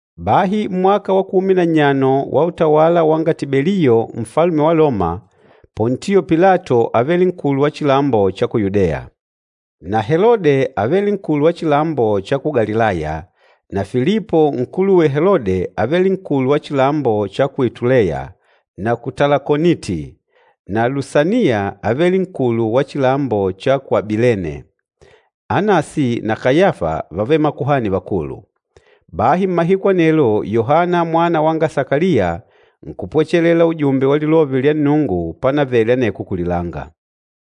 Bahi mmwaka wa kumi na nnyano wa utawala wanga Tibeliyo Nfalume wa Loma, Pontio Pilato ávele nkulu wa chilambo cha ku Yudeya. Na Helode ávele nkulu wa chilambo cha ku Galilaya na Filipo nkuluwe Helode ávele nkulu wa chilambo cha ku Ituleya na ku Talakoniti, na Lusaniya ávele nkulu wa chilambo cha ku Abilene, Anasi na Kayafa vávele Makuhani Vakulu. Bahi mmahiku anelo Yohana mwana wanga Sakaliya nkupwechelela ujumbe wa lilove lya Nnungu pánavele aneko kulilanga.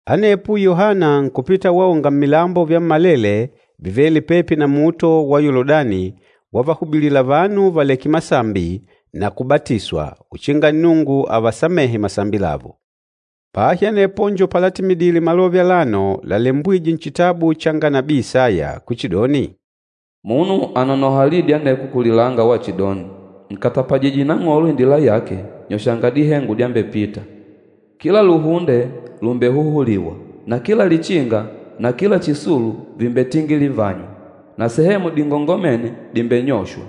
Anepo Yohana nkupita waonga mmilambo vyammalele vivêle pepi na luhunde lwa Yoludani wavahubilila vanu valeke masambi na kubatiswa uchinga Nnungu avasamehe masambi lavo. Bahi anepo njo palatimidile malove alano lalembwîje nchitabu changa nabii Isaya kuchidoni, “Munu ànonoha lidi aneko kulilanga wachidoni, ‘Nkatapajije Nang'olo indila yake, nyoshanga dihengo dyambepita. Kila lubobolo lùmbehuhuliwa, na kila lichinga na kila chisulu vìmbetingilivanywa, na sehemu dingongomêne dìmbenyoshwa,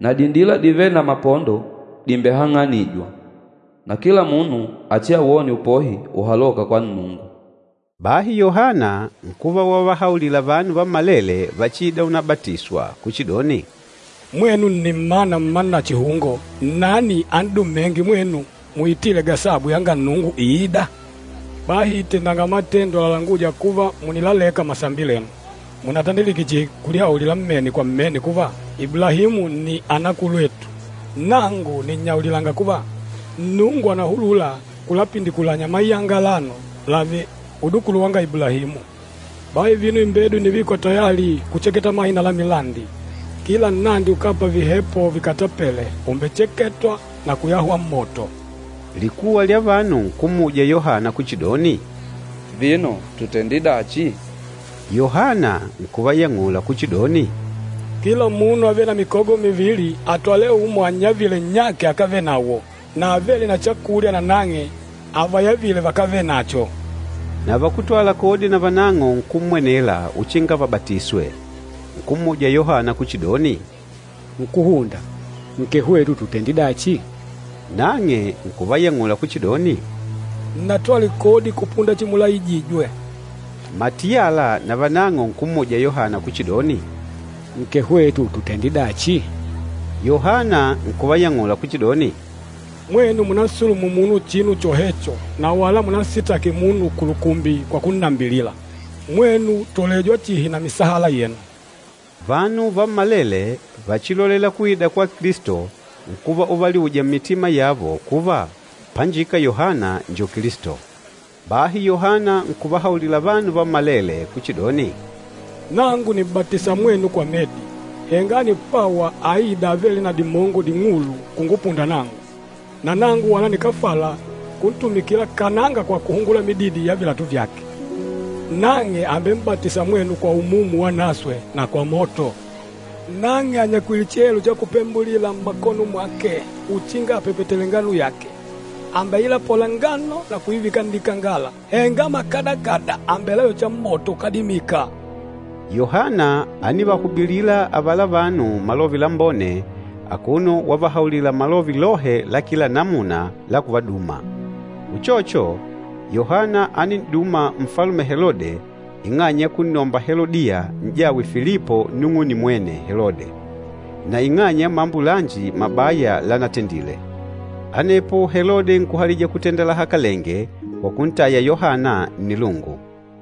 na dindila divêle na mapondo dìmbehang'anijwa. Na kila munu achiawone upohi uhalôka kwa Nnungu!’” Bahi Yohana nkuva wavahaulila vanu vammalele vachiîda unabatiswa kuchidoni, “Mwenu nni mmana mma nachihungo! Nnani an'dumênge mwenu muitile gasabu yanga Nnungu iîda? Bahi tendanga matendo lalangûja kuva mùnilaleka masambi lenu. Mùnatandilike chihi kulihaulila mmene kwa mmene kuva, ‘Iblahimu nni anakulwetu.’ Nangu nìnnyaulilanga kuva, Nnungu ànahulula kulapindikulanya mayanga alano lààve udukulu vanga Iblahimu. Bahi vino imbedo ìnivikwa tayali kucheketa mahina la milandi. Kila nnandi ukápa vihepo vikatapele umbecheketwa na kuyahwa mmoto.” Likuwa lya vanu nkummuja Yohana kuchidoni, “Vino tutende dachi?” Yohana nkuvayang'ula kuchidoni, “Kila munu avêle na mikogo mivili, atwale umo annyavile nnyake akávenawo, na avêle na chakulya nanang'e avayavile vakávenacho.” Na vakútwala kodi navanang'o nkummwenela uchinga vabatiswe, nkummuja Yohana kuchidoni, “Nkúhunda, nkee hwetu tutende dachi?” Nang'e nkuvayang'ula kuchidoni, “Nnatwale kodi kupunda chimulaijijwe.” Matiyala navanang'o nkummuja Yohana kuchidoni, “Nkee hwetu tutende dachi?” Yohana nkuvayang'ula kuchidoni, “Mwenu munampakanyole munu chinu chohecho, na wala munansitaki munu kulukumbi kwa kunnambilila. Mwenu tolelanga chihi na misahala yenu.” Vanu vammalele vachilolêla kuida kwa Kilisto, nkuva uvaliuja mmitima yavo kuva, panjika Yohana njo Kilisto. Bahi Yohana nkuvahaulila vanu vammalele kuchidoni, “Nangu nìm'batisa mwenu kwa medi, henga ànipwawa avenkwîda, avêle na dimongo ding'ulu kungupunda nangu, na nangu wala nikáfala kuntumikila kananga kwa kuhungula mididi ya vilatu vyake. Nang'e àmbem'batisa mwenu kwa Umumu Wanaswe na kwa moto. Nang'e ànyakwile chihelo cha kupembulila mmakono mwake uchinga apepetele ngano yake. Àmbeilapola ngano na kuivika nnikangala, henga mahahi àmbelayocha mmoto ukádimika.” Yohana ánivahubilila avala vanu Malove Lambone akuno wavahaulila malove lohe la kila namuna la kuvaduma. Uchocho, Yohana ánin'duma Nfalume Helode ing'anya ya kunnomba Helodiya, n'jawe Filipo nnung'une mwene Helode, na ing'anya ya mambo lanji mabaya lanatendile. Anepo Helode nkuhalija kutenda lahakalenge kwa kuntaya Yohana nnilungu.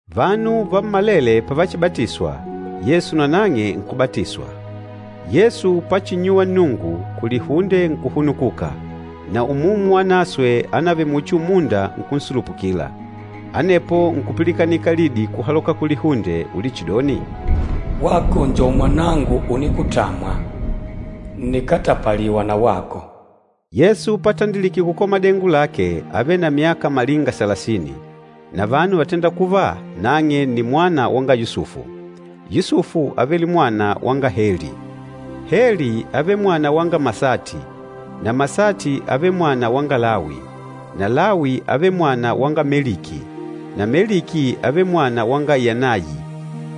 Vanu vammalele pavachibatiswa, Yesu nanang'e nkubatiswa. Yesu pachinnyuwa Nnungu, kulihunde nkuhunukuka, na Umumu Wanaswe ánavele muchi umunda nkunsulupukila. Anepo nkupilikanika lidi kuhaloka kulihunde ulichidoni, “Wako njo mwanangu unikutamwa, ǹnikatapaliwa na wako.” Yesu patandilike kukola madengo lake ávele na myaka malinga salasini, na vanu vátenda kuva nang'e ni mwana wanga Yusufu. Yusufu ávele mwana wanga Heli. Heli ávele mwana wanga Masati, na Masati ávele mwana wanga Lawi, na Lawi ávele mwana wanga Meliki, na Meliki ávele mwana wanga Yanayi,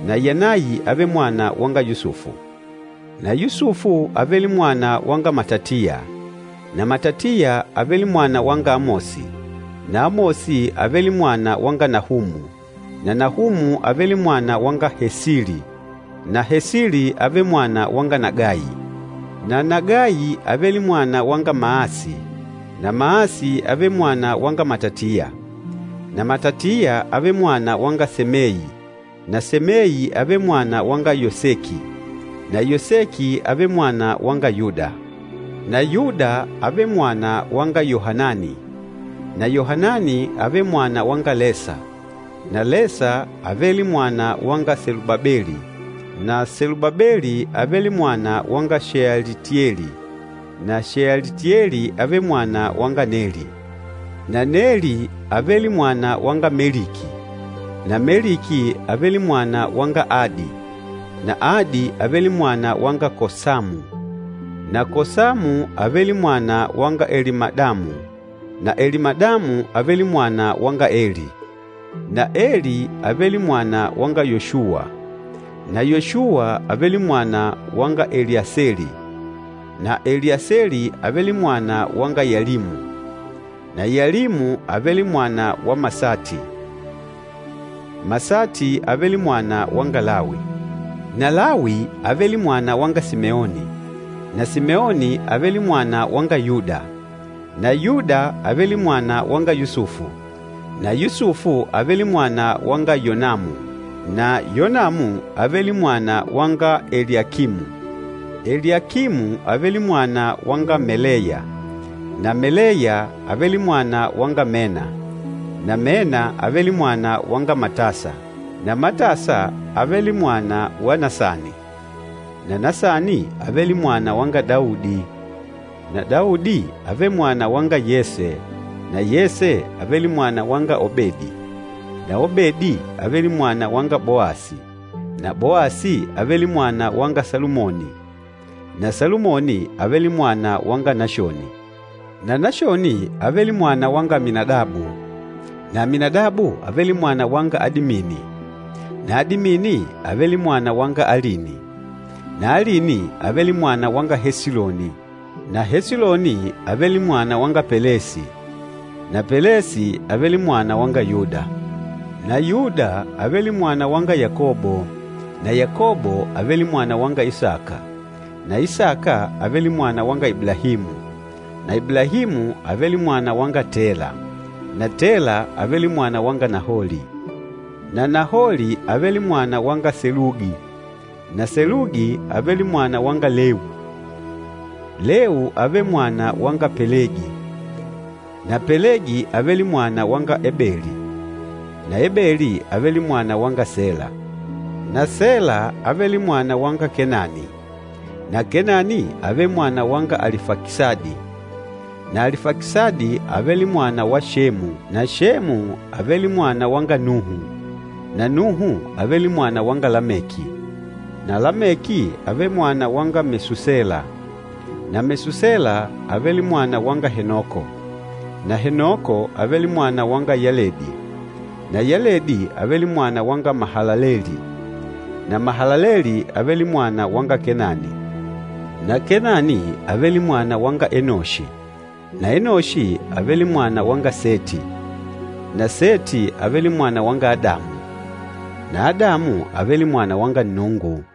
na Yanayi ávele mwana wanga Yusufu, na Yusufu ávele mwana wanga Matatiya, na Matatiya ávele mwana wanga Amosi, na Amosi ávele mwana wanga Nahumu, na Nahumu ávele mwana wanga Hesili, na Hesili ávele mwana wanga Nagayi, na Nagayi ávele mwana wanga Maasi, na Maasi ávele mwana wanga Matatiya, na Matatiya ávele mwana wanga Semeyi, na Semeyi ávele mwana wanga Yoseki, na Yoseki ávele mwana wanga Yuda, na Yuda ávele mwana wanga Yohanani, na Yohanani ávele mwana wanga Lesa, na Lesa ávele mwana wanga Selubabeli, na Selubabeli ávele mwana wanga Shealitieli, na Shealitieli ávele mwana wanga Neli, na Neli ávele mwana wanga Meliki, na Meliki ávele mwana wanga Adi, na Adi ávele mwana wanga Kosamu, na Kosamu ávele mwana wanga Elimadamu, na Elimadamu ávele mwana wanga Eli, na Eli ávele mwana wanga Yoshuwa, Yoshuwa ávele mwana wanga Eliaseli, na Eliaseli ávele mwana wanga Yalimu, na Yalimu ávele mwana wa Masati, Masati ávele mwana wanga Lawi, na Lawi ávele mwana wanga Simeoni, na Simeoni ávele mwana wanga Yuda, na Yuda ávele mwana wanga Yusufu, na Yusufu ávele mwana wanga Yonamu, na Yonamu ávele mwana wanga Eliakimu, Eliakimu ávele mwana wanga Meleya, na Meleya ávele mwana wanga Mena, na Mena ávele mwana wanga Matasa, na Matasa ávele mwa wa Nasani, na Nasani ávele mwana wanga Daudi, na Daudi ávele mwana wanga Yese, na Yese ávele mwana wanga Obedi, na Obedi ávele mwana wanga Boasi, na Boasi ávele mwana wanga Salumoni, na Salumoni ávele mwana wanga Nashoni, na Nashoni ávele mwana wanga Aminadabu, na Aminadabu ávele mwana wanga Adimini, na Adimini ávele mwana wanga Alini, na Alini ávele mwana wanga Esiloni, na Esiloni ávele mwana wanga Pelesi, na Pelesi ávele mwana wanga Yuda, na Yuda ávele mwana wanga Yakobo, na Yakobo ávele mwana wanga Isaka, na Isaka ávele mwana wanga Iblahimu, na Iblahimu ávele mwana wanga Tela, na Tela ávele mwana wanga Naholi, na Naholi ávele mwana wanga Selugi, na Selugi ávele mwana wanga Lewu, Lewu ávele mwana wanga Pelegi, na Pelegi ávele mwana wanga Ebeli, na Ebeli ávele mwana wanga Sela, na Sela ávele mwana wanga Kenani, na Kenani ávele mwana wanga Alifakisadi, na Alifakisadi ávele mwana wa Semu, na Semu ávele mwana wanga Nuhu, na Nuhu ávele mwana wanga Lameki, na Lameki ávele mwana wanga Mesusela, na Mesusela ávele mwana wanga Henoko, na Henoko ávele mwana wanga Yeledi, na Yeledi ávele mwana wanga Mahalaleli, na Mahalaleli ávele mwana wanga Kenani, na Kenani ávele mwana wanga Enoshi, na Enoshi ávele mwana wanga Seti, na Seti ávele mwana wanga Adamu, na Adamu ávele mwana wanga Nnungu.